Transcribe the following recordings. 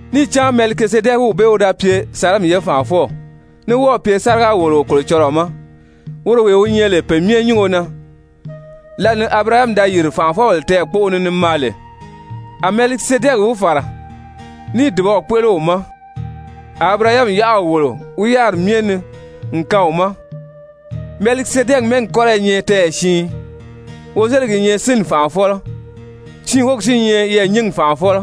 Níì cán Mɛlikizedɛkiw bee wi da pye Salɛmi Salɛmi: Mɔ ga lóʔo Salɛmi, mɛ́ɛgi bee kɔ́rɔ wi nyɛ yɛɛ̀nyingi. ye fànʔafɔw ní wɔ́ɔ̀ pye sáriga-wòloo Kolocɔlɔɔ ma, woro wee wi nyɛ lè Pe Myɛ Nyúngo na. Lǎli ni Abirahami da yìri fànʔafɔbèle tɛɛ̀kpoʔo ni ni maa lè, a Mɛlikizedɛki wi fàra níì dùbaw kpéʔele wi ma. A Abirahami yáʔaw wòlo wi yáriri myɛ ni n kaan wi ma. Mɛlikizedɛki mɛ́ɛgi kɔ́rɔ i nyɛ tɛɛyɛ siin: Wozeligi i nyɛ sínni fànʔafɔlɔ, siin wógi si i nyɛ yɛɛ̀nyingi fànʔafɔlɔ,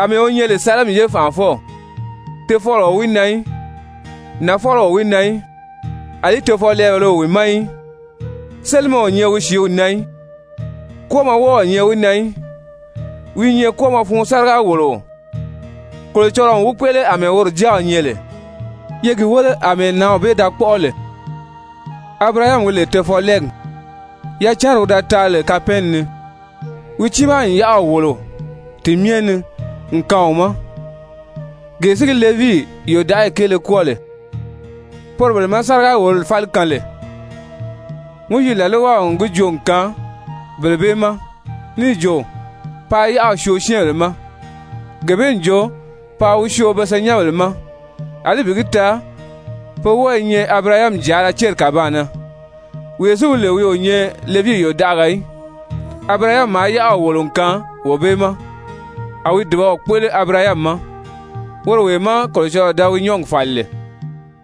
àmɛɛ wi nyɛ lè Salɛmi ye fànʔafɔw, Tofɔlɔ o wi na í, nafɔlɔ o wi na í, àlí tofɔlɛɛbèlē o wi na í. Sélimɛ o nyɛ wi sìíw na í, kwɔ́ɔmɔ wɔ́ɔ o nyɛ wi na í. Wi i nyɛ kwɔ́ɔmɔ fun sáriga-wòloo, Kolocɔlɔɔ n wi kpéʔele àmɛɛ woro Jáaw nyɛ lè. Ye gi wéle àmɛɛ nǎnw bee da kpɔ́ʔɔ lè, Abirahami wi lè tofɔlɛɛgi, yacanri wi da taa lè kapɛɛnni ni, wi tiimaa n yáʔaw wòlo ti myɛ ni n kaan wi ma! Gee si gi Levii yòdaʔayi kéele kwɔ́ɔ lè, poro bele má sáriga-wòlori fáli kaan lè, Mowizi làlwaw n gi joo n kaan bele bee ma níì jo, paa yáʔaw syoo syɛ́ɛnbèle ma, gee bee n jo paa wi syoo be senyɛnbèle ma, àlí bi gi taa pe wɔ́ɔ i nyɛ Abirahami jàala céri kàbaan na. Wee si wi lè wi o nyɛ Levii yòdaʔaga í, Abirahami maa yáʔaw wòlo n kaan wee bee ma! A wi dùbaw kpéʔele Abirahami ma woro wee má Kolocɔlɔɔ da wi nyɔ́ɔgi fàli lè!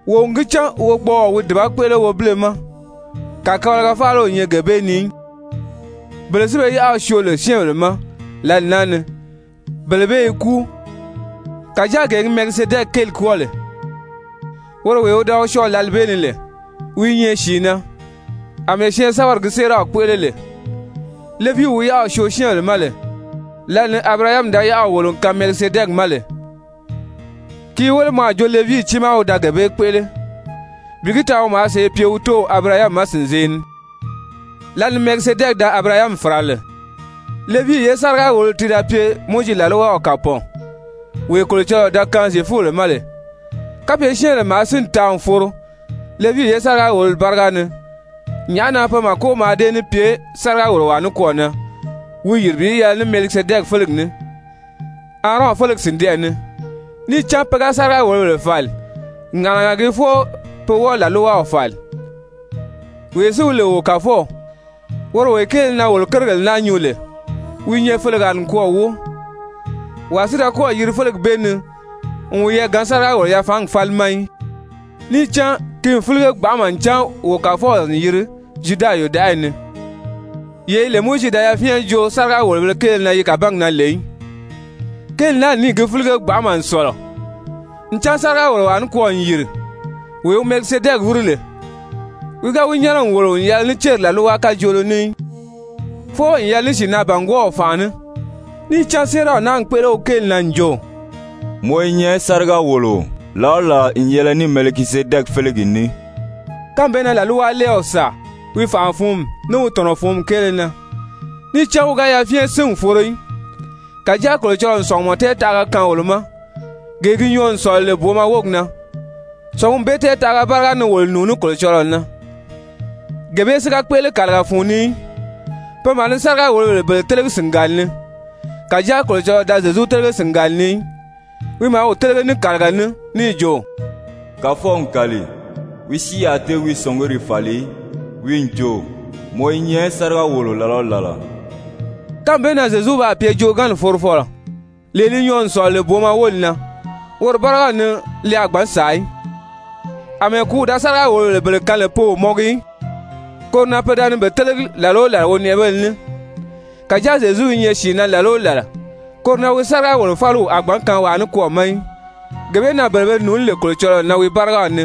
Wo n gi cán wogbɔɔɔ wi dùba kpéʔele wobile ma, kàkabalaga faala o nyɛ gee bee ni í. Bele si be yáʔaw syoo lè syɛ́ɛnbèle ma lǎli naa ni, bele bee i kúu, kàjáa gee gi Mɛlikizedɛki kéeli kwɔ́ɔ lè, woro wee wi da wi syɔɔ lǎli bee ni lè, wi i nyɛ sìi na àmɛɛ syɛɛnsɛ́bɛri gi séeraw kpéʔele lè. Levii wi yáʔaw syoo syɛ́ɛnbèle ma lè, lǎli ni Abirahami da yáʔaw wòlo n kaan Mɛlikizedɛki ma lè, ki i wéle mɔ a jo Levii tiimaa wi da gee bee kpéʔele, bi gi taa wi maa sèʔê pye wi tóow Abirahami ma sìnzee ni lǎli ni Mɛlikizedɛki da Abirahami fàra lè. Levii ye sáriga-wòlori ti da pye Mowizi làlwaw kàpɔɔn, wee Kolocɔlɔɔ da kaan Zyefubèle ma lè, kapye syɛ́ɛnbèle maa sínni taa n foro Levii ye sáriga-wòlori báriga ni, nyàʔá na pe màko mǎà dée ní pye sáriga-wòlowaa nikwɔɔ na wi yìri bi yɛlɛ ní Mɛlikizedɛki félegi ní, Aarɔn félegi sìndɛʔɛ ni? Níì cán pe ga sáriga-wòlobèle fàli, ŋàʔanaga gii fwɔɔ pe wɔ́ɔ làlwaw fàli. Wee si wi lè wo Kàfɔw, woro wee kéele na wolo kérigèle naa nyuu lè, wi i nyɛ felegaa nikwɔɔ wóo, wàa si da kɔ́ɔ̀ yiri félegi bee ni n wiyɛɛ gaan sáriga-wòlo-yafaangi fáli ma í. Níì cán ki n fílige gbanʔama ncan wo Kàfɔw n yiri Zyuda yòdaʔayi ni, yee yi lè Mowizi da yafyɛn joo sáriga-wòlobēle kéele na yi kàbaan na lè í. Kéeli naa n níì gi fílige gbanʔama n sɔ̀lɔ, ncan sáriga-wòlowaa nikwɔɔ n yìri, wee wi Mɛlikizedɛki wíri lè, wi ga wi nyɛ́nɛ n wòlo n yɛlɛ ní céri làlwa kajoolo ní í, fwɔɔ n yɛlɛ ní sìinaa-bàngwɔɔw fànʔa ní. Níì cán séeraw naa n kpéʔele wi kéeli na n jo: «Mɔ i nyɛ sáriga-wòloo làla o làla n yɛlɛ ní Mɛlikizedɛki félegi ní.» Kánmi bee na làlwalɛɛw sàa wi fànʔa-fǔnmi, ní wi tɔ̀nɔ-fǔnmi kéele na, níì cán wi ga yafyɛn sín n foro í, kàjáa Kolocɔlɔɔ n sɔ̀ngumɔ tɛɛtaʔaga kaan wolo ma, gee gi nyɔɔ n sɔ̀lɔ lè booma wógi na, sɔ̀ngumi bee tɛɛtaʔaga báriga ni wolo nùuní Kolocɔlɔɔ na. Gee bee si ga kpéʔele kàliga fun ni í. Pe maa ni sáriga-wòlobèle bele télegi sìngali ni. Kàjáa Kolocɔlɔɔ da Zyezu télege sìngali ni í, wi maa wi télege ní kàliga ní níì jo: «Kàfɔw n kàli, wi si a tée wi sɔ̀nguri fàli í, wi n jo: Mɔ i nyɛ sáriga-wòloo làla o làla.» Kánmi bee na Zyezu baa pye joogaanni forofɔlɔ, lee li nyɔɔ n sɔ̀lɔ lè booma wóli na. Woro bárigaw ni li a gbǎn sàa í, Amɛɛ kùúw da sáriga-wòlobèle bele kaan lè pe o mɔngi í, koro na pe da ni i télegi làla o làla wonɛʔɛbéle ní. Kàjáa Zyezu i nyɛ sìi na làla o làla, koro na wi sáriga-wòlo-fáliw a gbǎn kaan wàa nikwɔɔ ma í. Gee bee na bele be nùuní lè Kolocɔlɔɔ na wi bárigaw ni,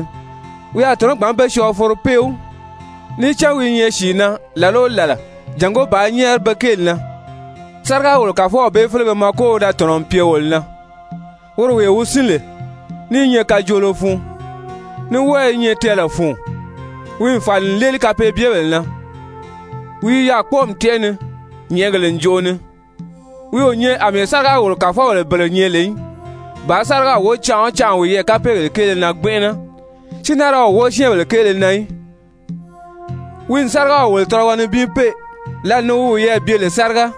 wi a tɔ̀nɔ́ gbǎn be syɔɔ foro péw, níì cán wi i nyɛ sìi na làla o làla jàngó bàā nyɛ́ɛri be kéeli na. Sáriga-wòlobèle kàfɔlɔ bee félege mako wi da tɔ̀nɔ n pye wolo na, woro wee wi sín lè, ní i nyɛ kajoolo fun, ní wɔ́ɔ i nyɛ tɛɛlɛ fun, wi n fàli n léeli kapeebyebèle na, wi i yaà kpɔ́ɔmi tɛ́ʔɛ ni, nyɛ̀ʔɛgèle ǹjoʔo ni. Wi o nyɛ àmɛɛ sáriga-wòlo-kàfɔbèle bele nyɛ lè í, bàā sáriga wóo canʔa o canʔa wiyɛɛ kapeegèle kéele na gbɛnʔɛnɛ, si naa ra wi wóo syɛ́ɛnbèle kéele na í. Wi n sárigaw wòlo tɔlɔgɔ nibin pée, lǎli ni wi wiyɛɛ bye lè sáriga.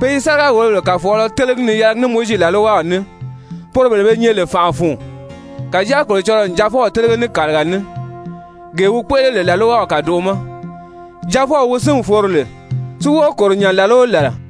Pe i sáriga-wòlobèle kàfɔɔlɔ télegi ni yɛlɛgi ní Mowizi làlwaw ní, poro bele be nyɛ lè fànʔa fun. Kàjáa Kolocɔlɔɔ n Jaafɔw télege ní kàliga ní, gee wi kpéʔele lè làlwaw kàdoʔo ma, Jaafɔw wi sín n foro lè, si wɔ́ɔ kòro nya làla o làla.